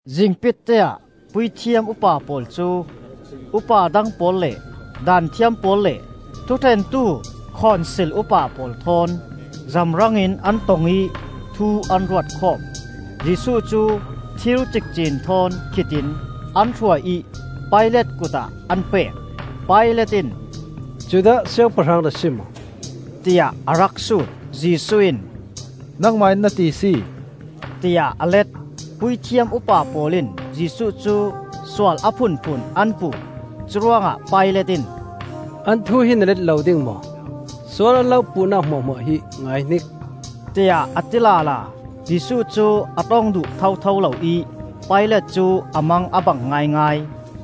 Zingpitte ah Puithiam upa pawl cu upa dang pawl le Daanthiam pawl le thuṭhentu Khonsil upa pawl thawn zamrangin an tong ih thu an ruat khawm. Jesuh cu thir cikcin thawn khit in an hruai ih Pilat kut ah an pek. Pilat in, “Judah siangpahrang na si maw?” tiah a rak sut. Jesuh in, “Nangmah in na ti si!” tiah a let. Puithiam upa pawl in Jesuh cu sual a phunphun an puh. Curuangah Pilat in, “An thu hi na let lo ding maw? Sual an lo puhnak hmuahhmuah hi ngaihnik,” tiah a ti lala. Jesuh cu a ṭong duh thotho lo ih Pilat cu a mang a bang ngaingai.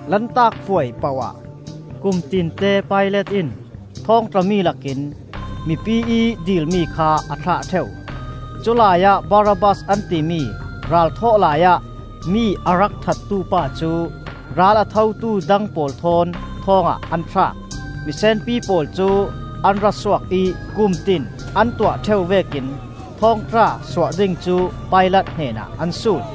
Lantak Puai poh ah kum tinte Pilat in thawngtla mi lakin mipi ih dilmi kha a thlah ṭheu. Culai ah Barabbas an timi, ralthawh laiah mi a rak thattu pa cu ral a thotu dang pawl thawn thawng ah an thlak. Misenpi pawl cu an ra suak ih kumtin an tuah ṭheu vekin thawngtla suah ding cu Pilat hnenah an sut.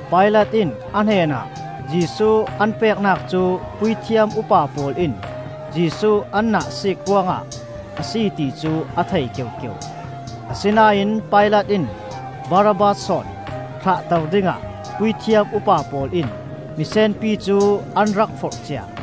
Pilat in a hnenah Jesuh an peknak cu Puithiam upa pawl in Jesuh an nahsiik ruangah a si ti cu a thei keukeu. Asinain Pilat in Barabbas sawn thlahter dingah puithiam upa pawl in misenpi cu an rak forhcia.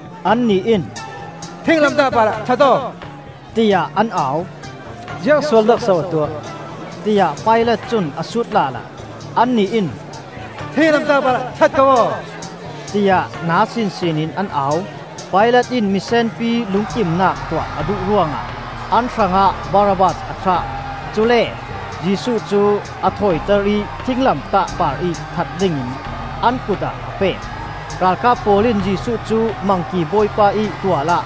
Annih in, “Thinglamtah parah that aw!” tiah an au. “Ziang sualnak so a tuah?” tiah Pilat cun a sut lala. Annih in, “Thinglamtah parah that ko aw!” tiah na sinsin in an au. Pilat in misenpi lungkimnak tuah a duh ruangah an hrangah Barabbas a thlah. Cule Jesuh cu a thawiter ih thinglamtah parih that dingin an kut ah a pek. Ralkap pawl in Jesuh cu Mangki bawipa ih tual ah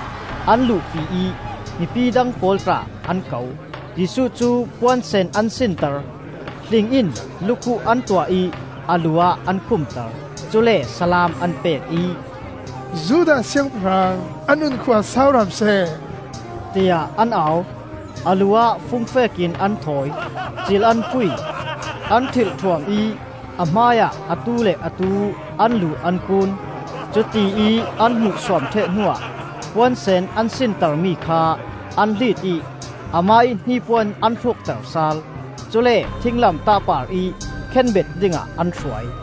an luhpi ih mipi dang pawl tla an ko. Jesuh cu puan sen an sinter; hling in lukhuh an tuah ih a lu ah an khumter. Cule salaam an pek ih, “Judah Siangpahrang, a nunkhua sau hram seh!” tiah an au. A lu ah fungfek in an thawi, cil an phui, an ṭhilhṭhuam ih a hmai ah atu le atu an lu an kuun. Cutiih an hmuhsuam ṭheh hnuah puansen an sintermi kha an hlit ih amah ih hnipuan an hrukter sal. Cule thinglamtah parih khenbet dingah an hruai.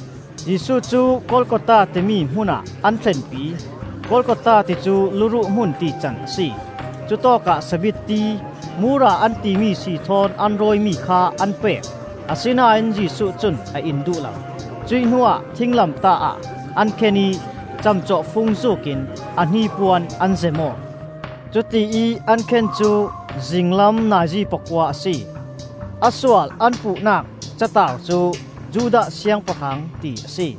Jesuh cu Golgotha timi hmun ah an thlenpi. Golgotha ti cu “Luruh hmun,” tican a si. Cutawkah sabitti, mura an timi sii thawn an rawimi kha an pek, asinain Jesuh cun a in duh lo. Cuih hnuah thinglamtah ah an khen ih camcawhfung zuukin a hnipuan an zem aw. Cutiih an khen cu zinglam nazi pakua a si. A sual an puhnak cataar cu, “Judah Siangpahrang,” ti a si.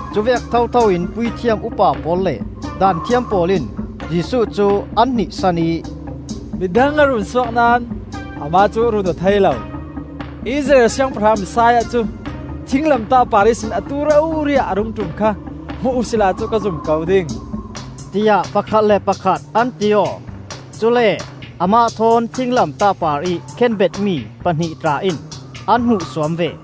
Cuvek thothoin Puithiam upa pawl le Daanthiam pawl in Jesuh cu an hnihsan ih, “Midang a runsuak naón amah cu a runsuak aw thei lo. Israel Siangpahrang, Messiah cu thinglamtah par ihsin atu rori ah a rung ṭum kha hmu uhsila cu kan zum ko ding,” tiah pakhat le pakhat an ti aw. Cule amah thawn thinglamtah parih khenbet mi pahnih tla in an hmuhsuam ve.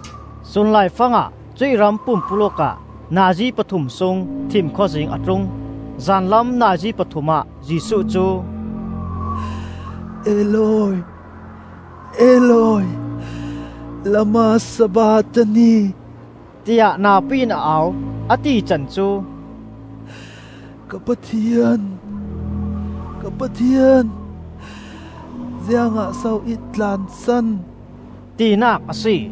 Sun laifangah cuih ram pumpuluk ah nazi pathum sung thimkhawzing a tlung. Zanlam nazi pathum ah Jesuh cu, “Eloi, Eloi, lema sabakthani!” tiah napi in a au. A tican cu, “Ka Pathian, ka Pathian, ziangah so i tlansan?” tinak a si.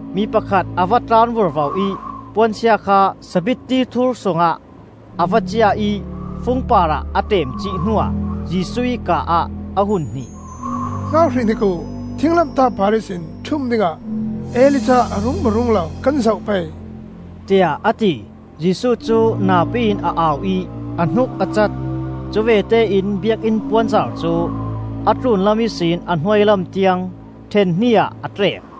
Mi pakhat a va tlan vurvo ih puansia kha sabitti thur sungah a va ciah ih fung parah a ṭemcih hnuah Jesuh ih kaa ah a hun hnih; “Hngak hrihhnik uh! Thinglamtah par ihsin ṭhum dingah Elijah a rung maw rung lo kan zoh pei,” tiah a ti. Jesuh cu napi in a au ih a hnuk a cat. Cuvete in Biakinn puanzar cu a tlunlam ihsin a hnuailam tiang ṭhen hnih ah a tlek.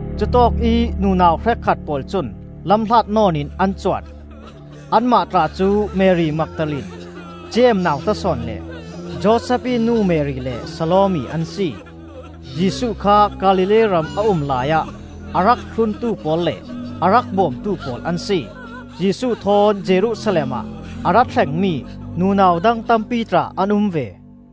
Cutawkih nunau hrekkhat pawl cun lamhlat nawn in an cuan. Anmah tla cu Mari Magdalene, Jeim nauta sawn le Josef ih nu Mari, le Salome an si. Jesuh kha Galilee ram a um laiah a rak thluntu pawl le a rak bawmtu pawl an si. Jesuh thawn Jerusalem ah a ra thlengmi nunau dang tampi tla an um ve.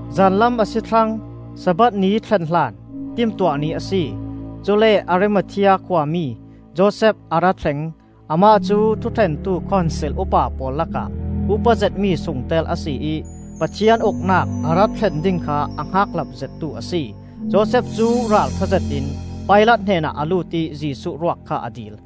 Zanlam a si thlang; sabbath ni thlen hlan Timtuah Ni a si. Cule Arimathea khuami Josef a ra thleng. Amah cu thuṭhentu Khonsil upa pawl lakah upat zetmi sungtel a si ih Pathian Uknak a ra thlen ding kha a hngakhlap zettu a si. Josef cu ralṭha zetin Pilat hnenah a lut ih Jesuh ruak kha a dil.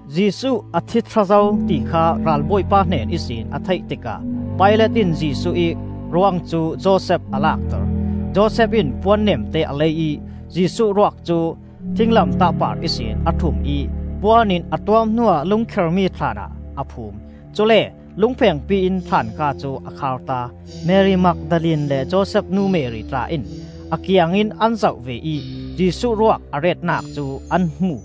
Jesuh a thi thla zo ti kha ralbawipa hnen ihsin a theih tikah Pilat in Jesuh ih ruang cu Josef a lakter. Josef in puan nemte a lei ih Jesuh ruak cu thinglamtah par ihsin a ṭhum ih puan in a tuam hnuah lungkhermi thlaan ah a phum. Cule lungphengpi in thlaan ka cu a kharta. Mari Magdalene le Josef nu Mari tla in a kiangin an zoh ve ih Jesuh ruak a retnak cu an hmu.